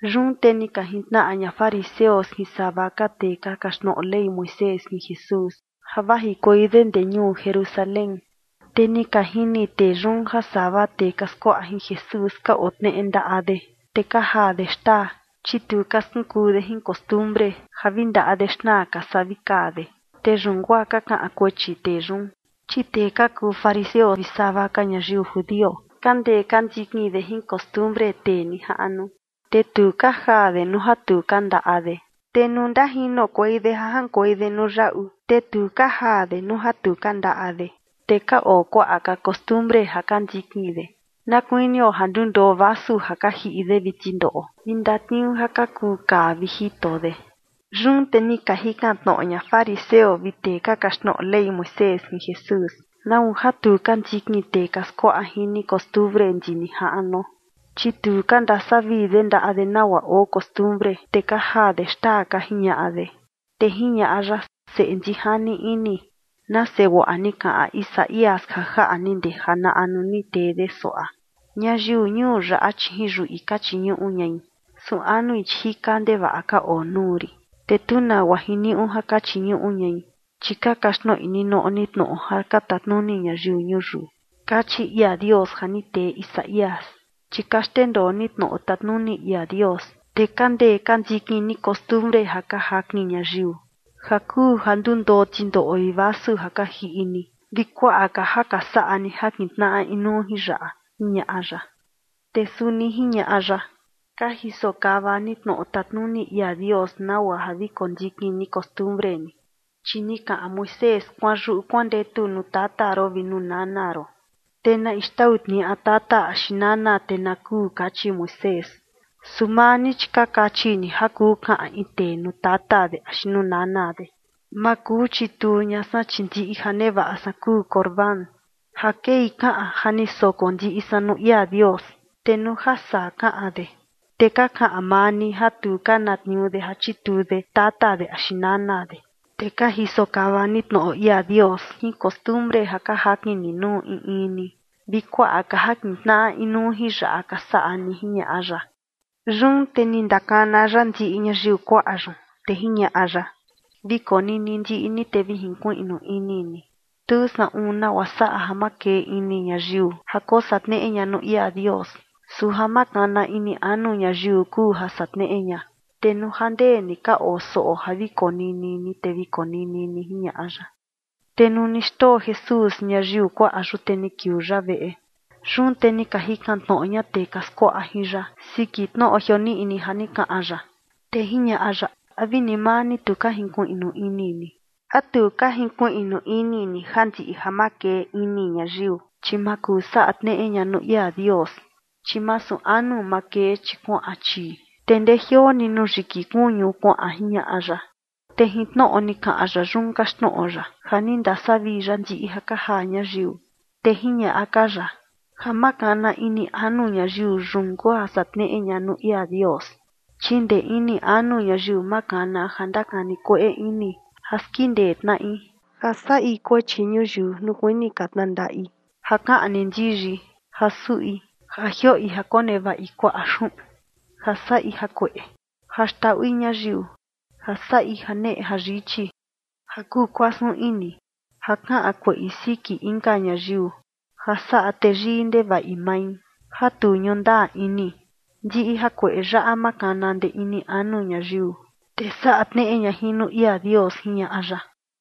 Yun te ni ka jintnaꞌa ña fariseo vi sava tee ka kaxtnoꞌo Ley Moisés jin Jesús, ja vajikuei de ndee ñuu Jerusalén. Te ni ka jini tee yun ja sava tee ka skuaꞌa jin Jesús ka otneꞌe ndaꞌa de, te ka jaa de xtaa, chi tu ka skunkuu de jin costumbre ja vi ndaꞌa de xnaa ka saa vi kaa de, te yun guaa ka kaꞌan kuechi tee yun. Chi tee ka kuu fariseo vi sava ka ñayiu judio ka ndee ka ndikin de jin costumbre tee nijaꞌnu, te tu ka jaa de nuu ja tu ka ndaꞌa de. Te nuu ndajinokuei de ja jaꞌankuei de nuu yaꞌu, te tu ka jaa de nuu ja tu ka ndaꞌa de. Te ka oo kuaꞌa ka costumbre ja ka ndikin de, na kuinio ja ndundoo vasu ja ka jiꞌi de vi tindoꞌo vi ndatniuu ja ka kuu kaa vi jito de. Yun te ni ka jikan tnoꞌo ña fariseo vi tee ka kaxtnoꞌo Ley Moisés jin Jesús: ―¿Nau ja tu ka ndikin tee ka skuaꞌa jin ni costumbre ndi nijaꞌnuo? Chi tu ka ndasavii de ndaꞌa de nagua oo costumbre, te ka jaa de xtaa ―ka jiñaꞌa de. Te jiñaꞌa ya: ―Seꞌe ndijani ini, nase guaꞌa ni kaꞌan Isaías ja jaꞌa ni ndee janaꞌa nuu ni tee de suaꞌa: Ñayiu ñuu yaꞌa, chi jin yuꞌi ka chiñuꞌu ñai, su anui, chi jika ndevaꞌa ka oo nuu rin. Te tu nagua jiniuꞌu ja ka chiñuꞌu ñai, chi ka kaxtnoꞌi ninoꞌo ni tnoꞌo ja ka tatnuni ñayiu ñuyiu. Kachi ia Dios ja ni tee Isaías. Chi ka xndendoo ni tnoꞌo tatnuni ia Dios, te ka ndee ka ndikin ni costumbre ja ka jakin ñayiu, ja kuu ja ndundoo tindoꞌo vi vasu ja ka jiꞌi ni, vi kuaꞌa ka ja ka saꞌa ni ja kintnaꞌa inuu jin yaꞌa ―jiñaꞌa ya. Te suni jiñaꞌa ya: ―Ka jiso kava ni tnoꞌo tatnuni ia Dios nagua ja vi kondikin ni costumbre ni. Chi ni kaꞌan Moisés: “Kuanyuꞌu kuandetu nuu tata ron vi nuu nana ron, te na in xtau tniaꞌa tata axi nana, te na kuu”, kachi Moisés. Su maa ni, chi ka kachi ni ja kuu kaꞌan in tee nuu tata de axi nuu nana de: “Ma kuu chituu ña san, chi ndiꞌi ja nevaꞌa san kuu Corbán” (ja kei kaꞌan ja ni soko ndiꞌi san nuu ia Dios). Te nuu ja saa kaꞌan de, te ka kaꞌan maa ni ja tu ka na tniuu de ja chituu de tata de axi nana de. Te ka jiso kava ni tnoꞌo ia Dios jin costumbre ja ka jakin ni nuu in in ni. Vi kuaꞌa ka ja kintnaꞌa inuu jin yaꞌa ka saꞌa ni ―jiñaꞌa ya. Yun te ni ndakana ya ndiꞌi ñayiu kuaꞌa yun, te jiñaꞌa ya: ―Vi konini ndiꞌi ni, te vi jinkuiꞌnu ini ni. Tu saꞌun nagua saꞌa ja makee ini ñayiu ja kosaꞌa tneꞌe ña nuu ia Dios. Su ja makana ini anu ñayiu kuu ja saꞌa tneꞌe ña. Te nuu ja ndee ni ka oo soꞌo ja vi konini ni te vi konini ni ―jiñaꞌa ya. Te nuu ni xndoo Jesús ñayiu kuaꞌa yun, te ni kiuu ya veꞌe. Yun te ni ka jikan tnoꞌo ña tee ka skuaꞌa jin ya siki tnoꞌo jioniꞌni ja ni kaꞌan ya. Te jiñaꞌa ya: ―¿A vi ni maa ni tu ka jinkuiꞌnu ini ni? ¿A tu ka jinkuiꞌnu ini ni ja ndiꞌi ja makee ini ñayiu, chi ma kuu saꞌa tneꞌe ña nuu ia Dios? Chi masu anu makee, chi kuaꞌan chii, te ndejioo ni nuu yiki kuñu kuaꞌan ―jiñaꞌa ya. Te jin tnoꞌo ni kaꞌan ya yun kaxtnoꞌo ya ja ni ndasavii ya ndiꞌi ja ka jaa ñayiu. Te jiñaꞌa ka ya: ―Ja makana ini anu ñayiu, yun kuu ja saꞌa tneꞌe ña nuu ia Dios. Chi ndee ini anu ñayiu, makana ja ndakani kueꞌe ini, ja skindee tnaꞌi, ja saꞌi kuechi ñuyiu nuu kuini ka tnandaꞌi, ja kaꞌni ndiyi, ja suꞌi, ja jioꞌi ja konevaꞌi kuaꞌa xuꞌun, ja saꞌi jakueꞌe, ja xndaꞌui ñayiu, ja saꞌi janeꞌe jayichi, ja kuu kuasun ini, ja kaꞌan kueꞌi siki inka ñayiu, ja saꞌa teyii ndevaꞌi mai, ja tu ñuꞌu ndaa ini. Ndiꞌi jakueꞌe yaꞌa makana ndee ini anu ñayiu, te saꞌa tneꞌe ña jin nuu ia Dios ―jiñaꞌa ya.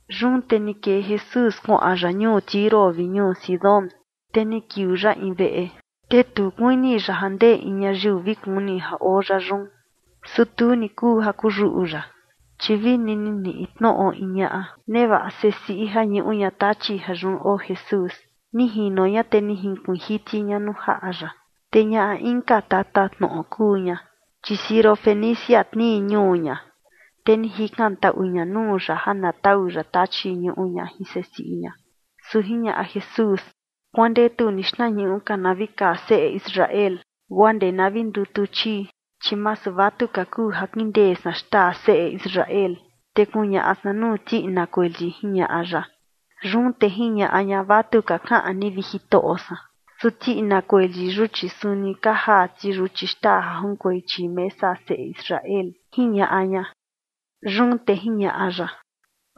Yun te ni kee Jesús kuaꞌan ya ñuu Tiro vi ñuu Sidón. Te ni kiuu ya in veꞌe, te tu kuini ya ja ndee in ñayiu vi kuni ja oo ya yun, su tu ni kuu ja kuyuꞌu ya. Chi vini ni niꞌi tnoꞌo in ñaꞌa nevaꞌa sesiꞌi ja ñuꞌu ña tachi ja yun oo Jesús, ni jino ña te ni junkuiin jiti ña nuu jaꞌa ya. Te ñaꞌa inka tatatnoꞌo kuu ña, chi Sirofenicia tnii ñuu ña. Te ni jikantaꞌu ña nuu ya ja na tau ya tachi ñuꞌu ña jin sesiꞌi ña. Su jiñaꞌa Jesús: ―Kuandetu ni xtnañuꞌu ka na vi kaa seꞌe Israel guaa ndee na vi ndutu chii, chi masu vatuka kuu ja kindee san xtaa seꞌe Israel, te kuñaꞌa san nuu tiꞌina kueli ―jiñaꞌa ya. Yun te jiñaꞌa ña: ―Vatuka kaꞌan ni, vi Jitoꞌo san, su tiꞌina kueli yun, chi suni ka jaa ti yuchi xtaa junkuei chii mesa seꞌe Israel ―jiñaꞌa ña. Yun te jiñaꞌa ya: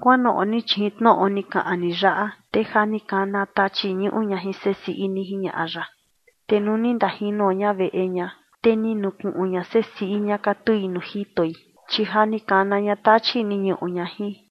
―Kuanoꞌo ni, chi jin tnoꞌo ni kaꞌan ni yaꞌa, te ja ni kana tachi ñuꞌu ña jin sesiꞌi ni ―jiñaꞌa ya. Te nuu ni ndajino ña veꞌe ña, te ni nukuꞌun ña sesiꞌi ña katui nuu jitoi, chi ja ni kana ña tachi ni ñuꞌu ña jin.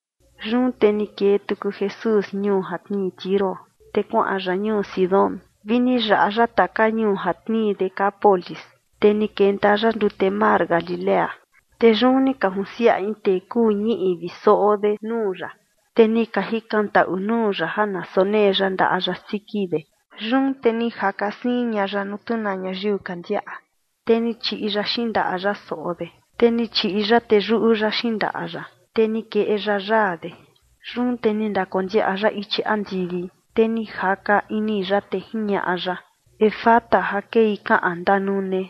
Yun te ni kee tuku Jesús ñuu ja tnii Tiro, te kuaꞌan ya ñuu Sidón vi ni yaꞌa ya taka ñuu ja tnii Decápolis, te ni kenta ya ndute mar Galilea. Te yun ni ka junsiaꞌa in tee kuu ñiꞌi vi soꞌo de nuu ya, te ni ka jikantaꞌu nuu ya ja na sonee ya ndaꞌa ya siki de. Yun te ni jaka siin ña ya nuu tu na ñayiu ka ndiaꞌa, te ni chiꞌi ya xindaꞌa ya soꞌo de, te ni chiꞌi ya teyuꞌu ya xindaꞌa ya, te ni keꞌe ya yaa de. Yun te ni ndakondiaꞌa ya ichi andivi, te ni jaka ini ya, te jiñaꞌa ya: ―¡Efata! ―ja kei kaꞌan ¡Ndanune!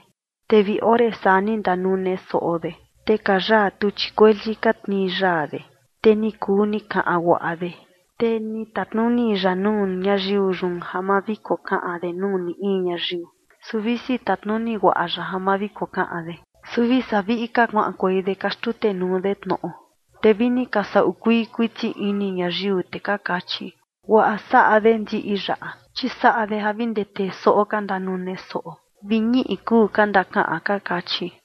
Te vi ore saa ni ndanune soꞌo de, te ka yaa tuchi kueli ka tnii yaa de, te ni kuu ni kaꞌan guaꞌa de. Te ni tatnuni ya nuu ñayiu yun ja ma vi kokaꞌan de nuu ni in ñayiu. Su visi tatnuni guaꞌa ya ja ma vi kokaꞌan de, su vi saa viꞌi ka kuaꞌankuei de ka xtutenuu de tnoꞌo. Te vi ni ka saꞌu kuii kuiti ini ñayiu, te ka kachi: ―Guaꞌa saꞌa de ndiꞌi yaꞌa, chi saꞌa de ja vi ndee tee soꞌo ka ndanune soꞌo vi ñiꞌi kuu ka ndakaꞌan ―ka kachi.